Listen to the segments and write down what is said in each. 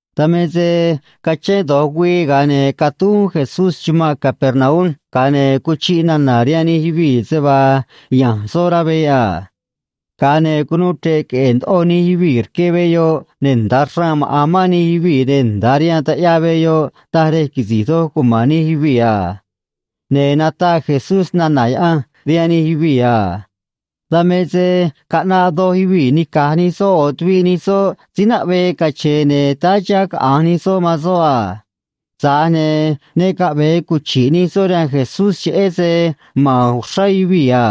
Dan me se cachén do̱j güii, ga̱a ne̱ catúj uún Jesús chumanꞌ Capernaum, ga̱a ne̱ cuchiꞌ nana̱ rihaan nij yuvii̱ se vaa ya̱nj soꞌ rá veꞌ a. Ga̱a ne̱ cunuu chre̱ꞌ queꞌe̱e̱ ndoꞌo nij yuvii̱ rque veꞌ yoꞌ, ne̱ nda̱a xraan maꞌa̱n mán nij yuvii̱, ne̱ nda̱a rihaan taꞌyaa veꞌ yoꞌ taj rej quisi̱j doj cuma̱n nij yuvii̱ a. Ne̱ nataꞌ Jesús snana̱ Yaꞌanj rihaan nij yuvii̱ a. Dan me se caꞌnaꞌ doj yuvii̱ nica̱j nij soꞌ ꞌo̱ tuviꞌ nij soꞌ síí naꞌvee cache̱e̱, ne̱ táá chiha̱ caꞌa̱nj nij soꞌ man soꞌ a. Tza̱j ne̱ ne caꞌve̱e cuchi̱ꞌ nij soꞌ rihaan Jesús, cheꞌé se ma̱n uxrá yuvii̱ a.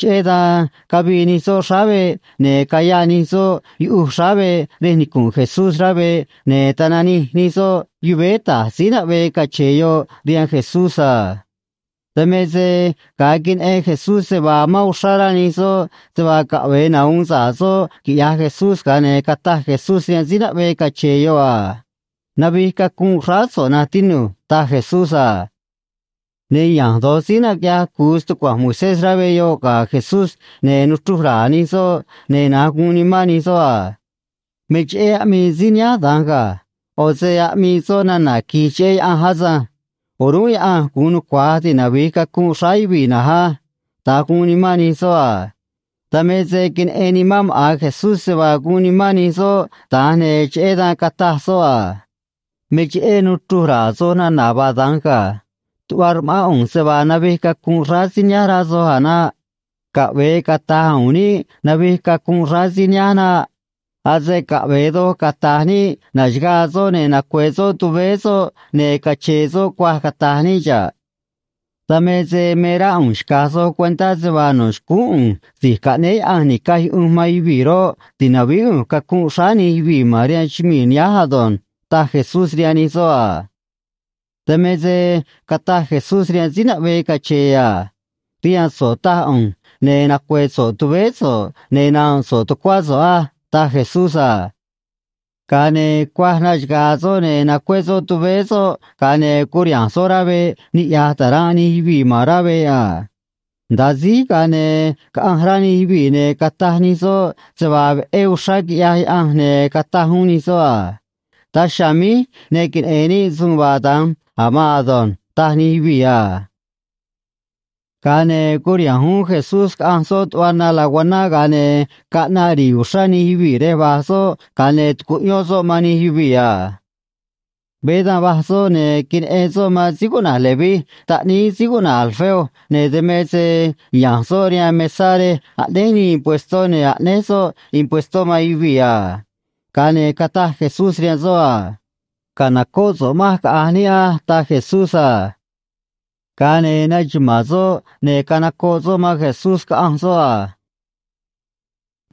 Cheꞌé dan cavii nij soꞌ xráá veꞌ, ne̱ cayaꞌ nij soꞌ yuꞌuj xráá veꞌ rej nicu̱nꞌ Jesús rá veꞌ, ne̱ tananij nij soꞌ yuvéé ta̱j síí naꞌvee cache̱e̱ yoꞌ rihaan Jesús a. Dan me se ga̱a queneꞌen Jesús se vaa amán uxrá rá nij soꞌ se vaa caꞌve̱e nahu̱un sa̱ꞌ soꞌ quiꞌya̱j Jesús, ga̱a ne̱ cataj Jesús rihaan síí naꞌvee cache̱e̱ yoꞌ a: ―Navij cacunꞌ xráá so̱ꞌ, na̱nj tinu̱j ―taj Jesús a. Ne̱ ya̱nj do̱j síí naquiꞌyaj cu̱u stucua̱nj Moisés rá veꞌ yoꞌ ga̱ Jesús, ne̱ nuchruj ra̱a̱ nij soꞌ, ne̱ na̱nj guun nimán nij soꞌ a: “Me cheꞌé aꞌmii síí nihánj da̱nj ga̱. ꞌO̱ se aꞌmii soꞌ nana̱ qui̱j cheꞌé Yaꞌanj asânj. O̱rúnꞌ Yaꞌanj gu̱un nucua̱j tinavi̱j cacunꞌ xráá yuvii̱ na̱nj á”, da̱nj guun nimán nij soꞌ a. Dan me se queneꞌen nimán maꞌa̱n Jesús se vaa guun nimán nij soꞌ da̱nj, ne̱ cheꞌé dan cataj soꞌ a: ―Me cheꞌé nuchruj ra̱a̱ soj nana̱ vaa da̱nj ga̱. Tuꞌva rma̱ꞌán ꞌu̱nj se vaa navij cacunꞌ xráá síí nihánj, rá soj a̱ naꞌ. Caꞌve̱e cata̱j u̱u̱n níꞌ navij cacunꞌ xráá síí nihánj naꞌ. Ase caꞌve̱e doj cata̱j níꞌ na̱xagaa soꞌ, ne̱ nacue̱ soꞌ tuvéé soꞌ, ne̱ cache̱e̱ soꞌ cuaj, cata̱j níꞌ xa̱ꞌ. Dan me se me rá ꞌu̱nj xca̱j soj cuentá se vaa no̱ xcúún ꞌu̱nj Si̱j Caꞌnéé Yaꞌanj Ni̱caj Yuꞌunj man Yuvii̱ roꞌ, ti̱navíí ꞌu̱nj cacunꞌ xráá nij yuvii̱ ma̱n rihaan chumii̱ nihánj ado̱nj ―taj Jesús rihaan nij soꞌ a. Dan me se cataj Jesús rihaan síí naꞌvee cache̱e̱ a: ―Rihaan so̱ꞌ taj ꞌu̱nj, ne̱ nacue̱ so̱ꞌ tuvéé so̱ꞌ, ne̱ na̱nꞌ so̱ꞌ tucuá so̱ꞌ á ―taj Jesús a. Ga̱a ne̱ cuaj naxaga̱a̱ soꞌ, ne̱ nacué soꞌ tuvéé soꞌ, ga̱a ne̱ curiha̱nj soꞌ rá veꞌ, niꞌya̱j ta̱ranꞌ nij yuvii̱ ma̱n rá veꞌ a. Nda̱a síj, ga̱a ne̱ caꞌanj rá nij yuvii̱, ne̱ cataj nij soꞌ se vaa veꞌé uxrá quiꞌyaj Yaꞌanj, ne̱ cataj uún nij soꞌ a: ―Daj chiha̱a̱ míj ne queneꞌe̱n níꞌ suun vaa da̱nj a̱ maan ado̱nj ―taj nij yuvii̱ a. Ga̱a ne̱ curiha̱nj uún Jesús, caꞌanj soꞌ tuꞌva na laguaná, ga̱a ne̱ caꞌnaꞌ ri̱i̱ uxrá nij yuvii̱ rej va̱j soꞌ, ga̱a ne̱ tucuꞌyón soꞌ man nij yuvii̱ a. Veé da̱nj va̱j soꞌ, ne̱ queneꞌen soꞌ man síí cuꞌna̱j Leví taꞌníí síí cuꞌna̱j Alfeo, ne̱ dan me se ya̱nj soꞌ rihaan mesá rej aꞌnéj nii impuestó, ne̱ aꞌnéj soꞌ impuestó man yuvii̱ a. Ga̱a ne̱ cataj Jesús rihaan soꞌ a: ―Ca̱nocóꞌ so̱ꞌ manj, caꞌa̱nj níꞌ á ―taj Jesús a. Ga̱a ne̱ naxuma̱a̱n soꞌ, ne̱ canocoꞌ soꞌ man Jesús, caꞌanj soꞌ a.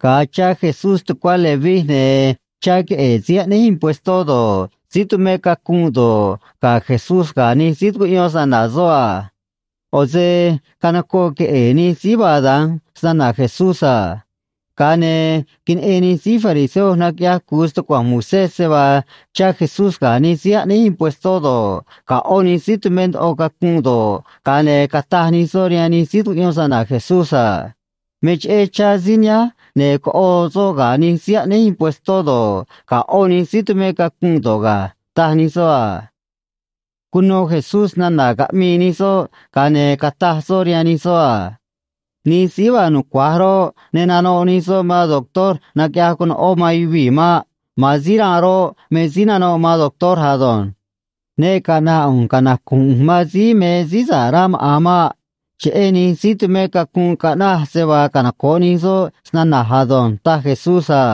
Ga̱a chá Jesús tucuá Leví, ne̱ chá queꞌe̱e̱ síí aꞌnéj impuestó do̱ꞌ, síí tumé cacunꞌ do̱ꞌ, ga̱ Jesús ga̱ nij síí tucuꞌyón snana̱ soꞌ a. ꞌO̱ se canocoꞌ queꞌe̱e̱ nij síí vaa da̱nj snana̱ Jesús a. Ga̱a ne̱ queneꞌen nij síí fariseo naquiꞌyaj cu̱u stucua̱nj Moisés se vaa chá Jesús ga̱ nij síí aꞌnéj impuestó do̱ꞌ, ga̱ ꞌó nij síí tumé ndoꞌo cacunꞌ do̱ꞌ, ga̱a ne̱ cataj nij soꞌ rihaan nij síí tucuꞌyón snana̱ Jesús a: ―Me cheꞌé chá síí nihánj ne̱ coꞌo soꞌ ga̱ nij síí aꞌnéj impuestó do̱ꞌ, ga̱ ꞌó nij síí tumé cacunꞌ do̱ꞌ ga̱ ―taj nij soꞌ a. Cuno Jesús nana̱ caꞌmii nij soꞌ, ga̱a ne̱ cataj soꞌ rihaan nij soꞌ a: ―Nij síí vaa nucua̱j roꞌ, ne nanoꞌ nij soꞌ man doctor naquiꞌyaj conoꞌó man yuvii̱ maꞌ. Ma̱an síí ranꞌ roꞌ, me síí nanoꞌ man doctor ado̱nj. Ne caꞌna̱ꞌ ꞌu̱nj canacu̱nj ꞌu̱nj man síí me síí sa̱ꞌ rá maꞌa̱n maꞌ. Cheꞌé nij síí tumé cacunꞌ caꞌnaj se vaa canoco̱ꞌ nij soꞌ snana̱j ado̱nj ―taj Jesús a.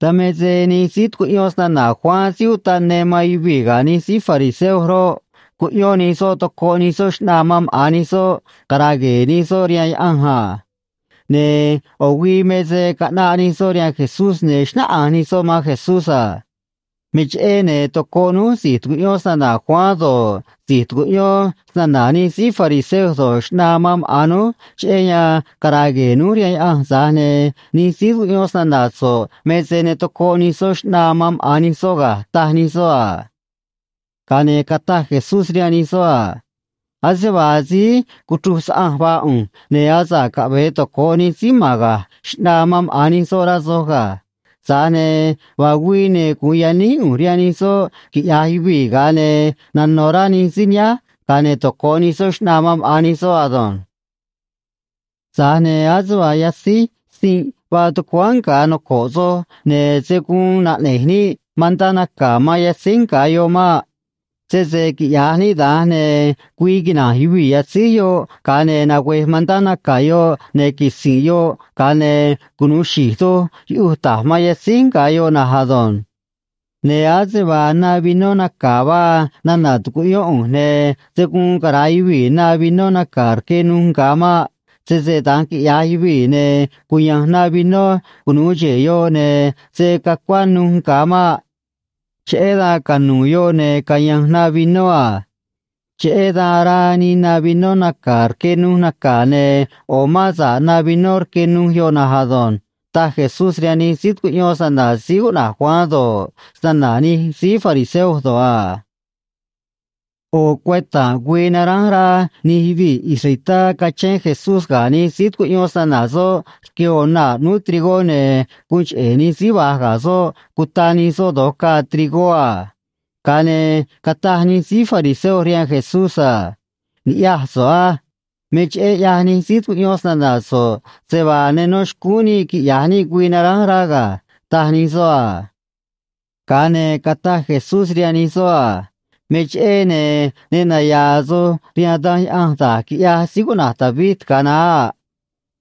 Dan me se nij síí tucuꞌyón snana̱ Juan Síí Utaꞌ Ne man yuvii̱ ga̱ nij síí fariseo roꞌ, cuꞌyón nij soꞌ tocoꞌ nij soꞌ xꞌnaa man maꞌa̱n nij soꞌ, cara̱a̱ gue̱e̱ nij soꞌ rihaan Yaꞌanj a. Ne̱ ꞌo̱ güii me se caꞌnaꞌ nij soꞌ rihaan Jesús, ne̱ xnáꞌanj nij soꞌ man Jesús a: ―Me cheꞌé, ne̱ tocoꞌ núj si̱j tucuꞌyón snana̱ Juan do̱ꞌ, si̱j tucuꞌyón snana̱ nij síí fariseo do̱ꞌ, xꞌnaa man maꞌa̱n núj cheꞌé yan cara̱a̱ gue̱e̱ núj rihaan Yaꞌanj, tza̱j ne̱ nij síí tucuꞌyón snana̱ so̱ꞌ me se ne tocoꞌ nij soꞌ xꞌnaa man maꞌa̱n nij soꞌ ga̱ ―taj nij soꞌ a. Ga̱a ne̱ cataj Jesús rihaan nij soꞌ a: ―Ase vaa síí cuchruj saꞌanj vaa ꞌu̱nj, ne̱ asa̱ꞌ caꞌve̱e toco̱ꞌ nij síí ma̱n ga̱j xꞌnaa man maꞌa̱n nij soꞌ, rá soj ga̱. Tza̱j ne̱ vaa güii, ne̱ gu̱un yaníj ꞌu̱nj rihaan nij soꞌ, quiꞌya̱j yuvii̱, ga̱a ne̱ nano̱ rá nij síí nihánj, ga̱a ne̱ toco̱ꞌ nij soꞌ xꞌnaa man maꞌa̱n nij soꞌ ado̱nj. ’Tza̱j ne̱ ase vaa yatzíj sinꞌ vaa tucuáán nga̱ noco̱ꞌ soj, ne̱ se̱ guun naꞌne̱j níꞌ mantá naca̱ man yatzíj nga̱ yoꞌ maꞌ. Sese quiꞌya̱j níꞌ da̱nj, ne̱ güii quina̱nj yuvii̱ yatzíj yoꞌ, ga̱a ne̱ nagüe̱j mantá naca̱ yoꞌ, ne̱ quisi̱nꞌ yoꞌ, ga̱a ne̱ cunu̱u xi̱j doj yuꞌuj ta̱j man yatzíj nga̱ yoꞌ na̱nj ado̱nj. Ne̱ ase vaa na vinó naca̱ vaa nana̱ tucuꞌyón ꞌu̱nj, ne̱ se̱ guun cara̱a yuvii̱ na vinó naca̱ rque nuj nga̱ maꞌ. Sese da̱nj quiꞌya̱j yuvii̱, ne̱ cuya̱nj na vinó cunu̱u xe̱e̱ yoꞌ, ne̱ se̱ cacuá nuj nga̱ maꞌ. Cheꞌé dan canu̱u̱ yoꞌ, ne̱ caya̱nj na vinó a. Cheꞌé dan araa nii na vinó naca̱ rque nuj naca̱, ne̱ ꞌo̱ mán sa̱ꞌ na vinó rque nuj yoꞌ na̱nj ado̱nj ―taj Jesús rihaan nij síí tucuꞌyón snana̱ síí cuꞌna̱j Juan do̱ꞌ, snana̱ nij síí fariseo do̱ꞌ a. ꞌO̱ cueta̱nꞌ güii naránj rá nij yuvii̱ israelitá cachén Jesús ga̱ nij síí tucuꞌyón snana̱ soꞌ rque ꞌo̱ naa̱ ꞌnúú trigó, ne̱ guun cheꞌe̱ nij síí va̱j ga̱ soꞌ cuta nij soꞌ do̱j caa trigó a. Ga̱a ne̱ cataj nij síí fariseo rihaan Jesús a: ―Ni̱ꞌyaj so̱ꞌ á. Me cheꞌé ꞌyaj nij síí tucuꞌyón snana̱ so̱ꞌ se vaa ne nó xcúún níꞌ quiꞌya̱j níꞌ güii naránj rá ga̱ ―taj nij soꞌ a. Ga̱a ne̱ cataj Jesús rihaan nij soꞌ a: ―Me cheꞌé, ne̱ ne naya̱a̱ soj rihaan Danj Yaꞌanj da̱j quiꞌyaj síí cuꞌna̱j David ga̱a naá a.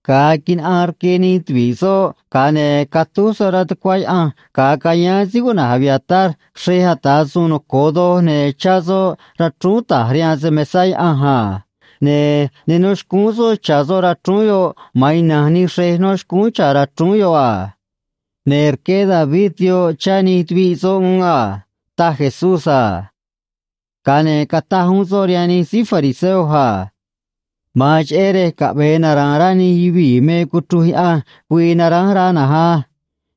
Ga̱a quinaꞌaan rque nij tuvi̱ꞌ soꞌ, ga̱a ne̱ catúj soꞌ rá tucuá Yaꞌanj ga̱a cayáán síí cuꞌna̱j Abiatar xrej ata̱ suun noco̱o doj, ne̱ chá soꞌ rachrúún ta̱j rihaan se‑mesa̱ Yaꞌanj a. Ne̱ ne nó xcúún soꞌ cha̱ soꞌ rachrúún yoꞌ, ma̱an ina̱nj nij xrej nó xcúún cha̱ rachrúún yoꞌ a. Ne̱ rqué David yoꞌ chá nij tuviꞌ soꞌ uún a ―taj Jesús a. Ga̱a ne̱ cataj uún soꞌ rihaan nij síí fariseo a: ―Ma̱an cheꞌé rej caꞌve̱e nara̱a̱n rá nij yuvii̱ me cuchruj Yaꞌanj güii naránj rá na̱nj á.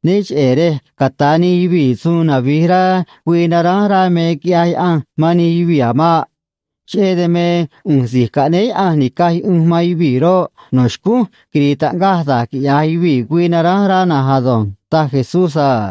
Né cheꞌe̱ rej ca̱ta̱ nij yuvii̱ suun navi̱j rá güii naránj rá me quiꞌyaj Yaꞌanj man nij yuvii̱ a̱ maꞌ. Cheꞌé dan me, ꞌu̱nj Si̱j Caꞌnéé Yaꞌanj Ni̱caj Yuꞌunj man Yuvii̱ roꞌ, no̱ xcúnj quiri̱i̱ taꞌngaj da̱j quiꞌya̱j yuvii̱ güii naránj rá na̱nj ado̱nj ―taj Jesús a.